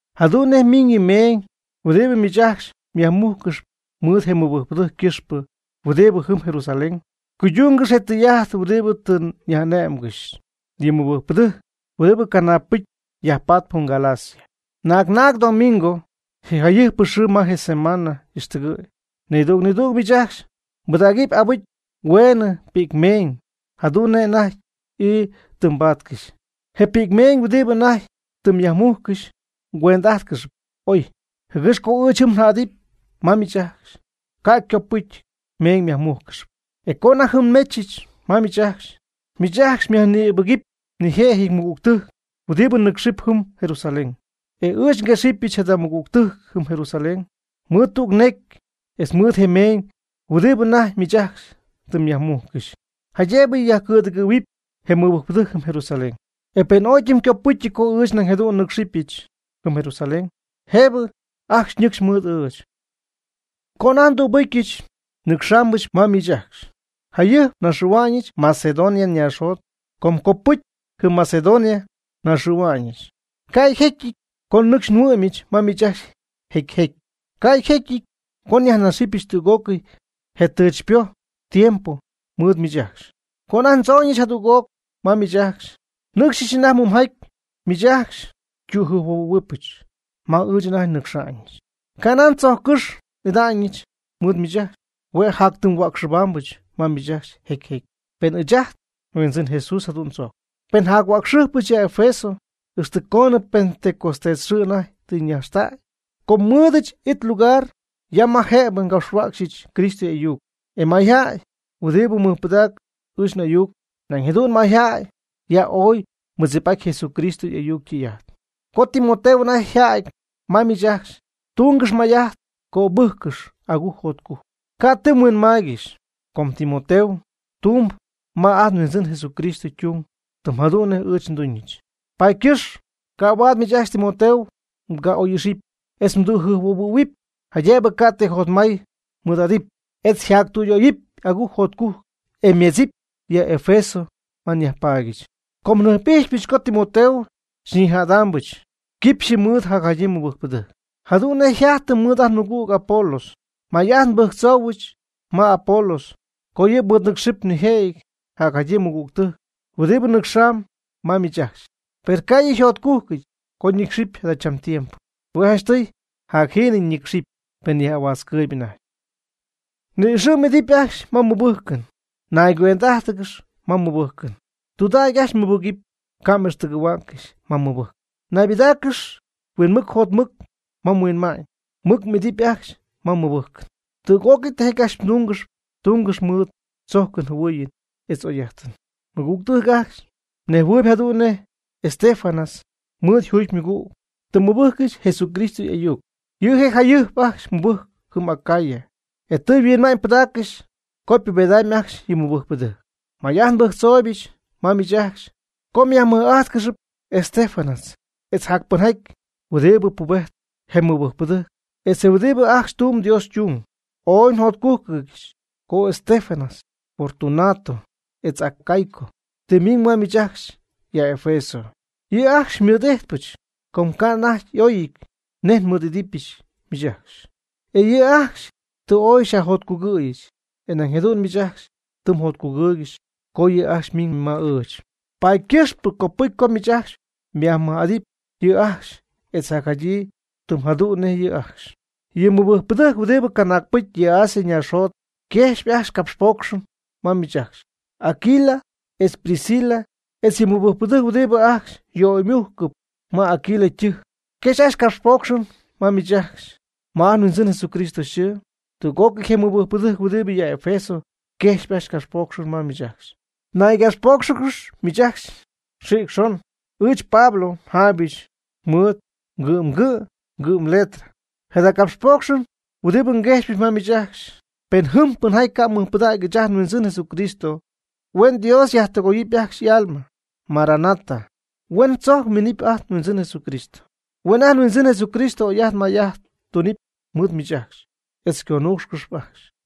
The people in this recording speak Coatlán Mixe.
Jadu'n nej ymiñ yɨ meeñ huɨdibɨ miich ajcxy myajmujccɨxyp mɨɨd je mɨbɨjcpɨdɨjc ycɨxpɨ huɨdibɨ jɨm Jerusalén. Cuydungɨx je tɨy'ajt huɨdibɨ tɨ nyaj'ané'mgɨxyɨch yɨ mɨbɨjcpɨdɨjc huɨdibɨ canaagpɨcy yajpatp jɨm Galacia. Naag naag domingo, je jayɨjpɨ xɨɨ ma je semana y'ixtɨgɨ̈y nidüg nidüg miich ajcxy mbɨdägɨp abɨcy hueenɨ pi'cmeeñ, jadu'n nej anajty ii tɨ mbaatcɨxy. Je pi'cmeeñ huɨdibɨ anajty tɨ myajmujccɨxy mgüend'ájtcɨxɨpy ooy, jɨgɨx co ɨɨch jɨm njädɨp ma miich ajcxy, ca' ycopɨcyɨty meeñ myajmújcɨxɨpy. E co anajty jɨm nmechɨch ma miich ajcxy, miich ajcxy myajnïbɨgɨpy nijëjɨty mɨgügtɨjc huɨdibɨ nɨcxɨp jɨm Jerusalén. E ɨɨch nguexɨpyɨch jada mɨgügtɨjc jɨm Jerusalén mɨɨd tüg necy etz mɨɨd je meeñ huɨdibɨ anajty miich ajcxy tɨ myajmujccɨxy, jaydëbɨ yajcɨ̈dɨgɨ̈huɨp je mɨbɨjcpɨdɨjc jɨm Jerusalén. E pen ooy ytɨmycopɨcyɨty co ɨɨch nañ jadu'n nnɨ́cxɨbɨch jɨm Jerusalén, jëbɨ ajcxy ñɨcxy mɨɨd ɨɨch. Co anajty ndübɨcyɨch nnɨcxaambɨch ma miich ajcxy, jayɨjp naxɨ̈hua'ñɨch Macedonia naaxjot, com copɨcy jɨm Macedonia naxɨ̈hua'ñɨch. Ca' jecyɨty co nɨcxy nhuɨ'myɨch ma miich ajcxy jecy jecy. Ca' yjecyɨty co nyajnaxɨpyɨch tüg'ócɨy je tɨchypoj tiempo mɨɨd miich ajcxy. Co anajty ndzooñɨch jadüg'oc ma miich ajcxy, nnɨ́cxyɨch anajty muumjaty, miich ajcxy xytüjɨjphuohuɨ̈huɨbɨch ma ɨɨch anajty nnɨcxa'ñɨch. Ca' nan tzojccɨ́xy n'ida'ñɨch mɨɨd miich ajcxy, hue' jatytimy huäcxɨbaambɨch ma miich ajcxy jecy jecy, pen ɨɨch ajt nHuindzɨn Jesús jadu'n tzojcp. Per njac-huäcxɨbaambɨch ya Efeso ixtɨ coonɨ Pentecostés xɨɨ anajty tɨ ñajxtäy. Com nmɨɨdɨch it lugar ya ma jëbɨ ngapxhuäcxyɨch Cristo y'ayuc, e mayjäy huɨdibɨ mɨjpɨdacp ɨɨch n'ayuc, nañ jadu'n mayjäy ya ooy mɨdzip'aty Jesucristo y'ayuc ytɨy'ajt. Co Timoteo anajty yjädy ma miich ajcxy, tungɨxy may'ajt mgöbɨ́jccɨxɨpy agujc jotcujc ca' ti mhuinmaaygɨxy, com Timoteo tumb ma ajt nHuindzɨn Jesucristo ytung tɨm jadu'n nej ɨɨch nduñɨch. Paady ycɨxp ca' huaad miich ajcxy Timoteo mga'oy'ixɨpy etz mdüjɨjphuohuɨ̈huɨpy, jaydëbɨ ca' ti jotmay mɨɨd'adɨpy etz yjactüyöyɨp agujc jotcujc, e ymedzɨpy ya Efeso ma nyajpaadyɨch. Com njɨjp'ijxypɨch co Timoteo xyñijädɨbɨch quipxyɨ mɨɨd jacjadyii mɨbɨjcpɨdɨjc. Jadu'n nej yjajtɨ mɨɨd ajt nmɨgüg Apolos. May'ajt nbɨjctzoohuɨch ma Apolos co yɨ' mɨɨdnɨcxɨp nijëjɨty jacjadyii mɨgügtɨjc huɨdibɨ nɨcxamb ma miich ajcxy. Per ca' yɨ' yjotcujcɨty co ñɨcxɨp jadachambɨ tiempo. Hue' janchtɨy jacjiinɨ yñɨcxɨpy, pen yaj'ahuätzcɨɨyb anajty. Ni'ixɨ̈ m'idɨpy ajcxy ma mmɨbɨjcɨn. Naygüend'ájtɨgɨx ma mmɨbɨjcɨn. Tɨydudägy ajcxy mmɨbɨgɨpy, ca' m'ixtɨgɨ̈huäccɨxy ma mmɨbɨjcɨn. Naybɨdáacɨgɨx huinmɨc jotmɨc ma mhuinma'ñ. Mɨc m'idɨpy ajcxy ma mmɨbɨjcɨn. Tüg'ócɨy tijaty ajcxy mdungɨxy, tungɨxp mɨɨd tzojcɨn jɨhuɨɨyɨn etz oyjäy'ajtɨn. Mɨgügtɨjc ajcxy, mnejhuɨɨyb jadu'n nej Estéfanas mɨɨd yjugymɨgüg tɨ mɨbɨjccɨxy Jesucristo y'ayuc. Yɨ' je' jayɨjp ajcxy mɨbɨjcp jɨm Acaya, e tɨ yhuinma'ñypɨdaaccɨxy co ypubedamyb ajcxy yɨ mɨbɨjcpɨdɨjc. May'ajt nbɨjctzooybɨch ma miich ajcxy co myajmij'ájtcɨxɨpy Estéfanas, etz jac pɨnjaty huɨdibɨ pubejtp je mɨbɨjcpɨdɨjc etz huɨdibɨ ajcxy tumb Dios ytung. Ooy njotcújcɨdyɨch co Estéfanas, Fortunato, etz Acaico tɨ ymiñ ma ɨɨch ajcxy ya Efeso. Yɨ' ajcxy xymɨɨd'ijtpɨch, com ca' anajty y'oyɨ̈y nej nmɨɨd'idɨpyɨch miich ajcxy. E yɨ' ajcxy tɨ ooy xyajjotcugɨ̈yɨch, e nañ jadu'n miich ajcxy tɨ mjotcugɨɨygɨxy co yɨ' ajcxy ymiñ ma ɨɨch. Paady ycɨxp copɨcy co miich ajcxy myajmɨj'adɨp yɨ' ajcxy etz jacjadyii tɨm jadu'n nej yɨ' ajcxy. Yɨ mɨbɨjcpɨdɨjc huɨdibɨ canaagpɨcy ya Asia naaxjot yquejxyp ajcxy capxpoocxɨn ma miich ajcxy. Aquila etz Priscila etz yɨ mɨbɨjcpɨdɨjc huɨdibɨ ajcxy yöymujcɨp ma Aquila ytɨjc yquejxp ajcxy capxpoocxɨn ma miich ajcxy ma ajt nHuindzin Jesucristo yxɨɨ. Tüg'ócɨy je mɨbɨjcpɨdɨjc huɨdibɨ ya Efeso yquejxp ajcxy capxpoocxɨn ma miich ajcxy. Naygapxpóocxɨgɨxy miich ajcxy xïc xon. Ɨɨch, Pablo, njaaybɨch mɨɨd ngɨ'mgɨ' ngɨ'mletra jada capxpoocxɨn huɨdibɨ nguejxypɨch ma miich ajcxy. Pen jɨm pɨnjaty ca' mɨjpɨdägy ɨɨch ajt nHuindzɨn Jesucristo, huen Dios yajtɨgooyɨp ajcxy y'alma. ¡Maranata! Huen tzojc yminɨpy ajt nHuindzɨn Jesucristo. Huen ajt nHuindzɨn Jesucristo oy'ajt may'ajt tunɨpy mɨɨd miich ajcxy etz xyconuucxɨp ajcxy.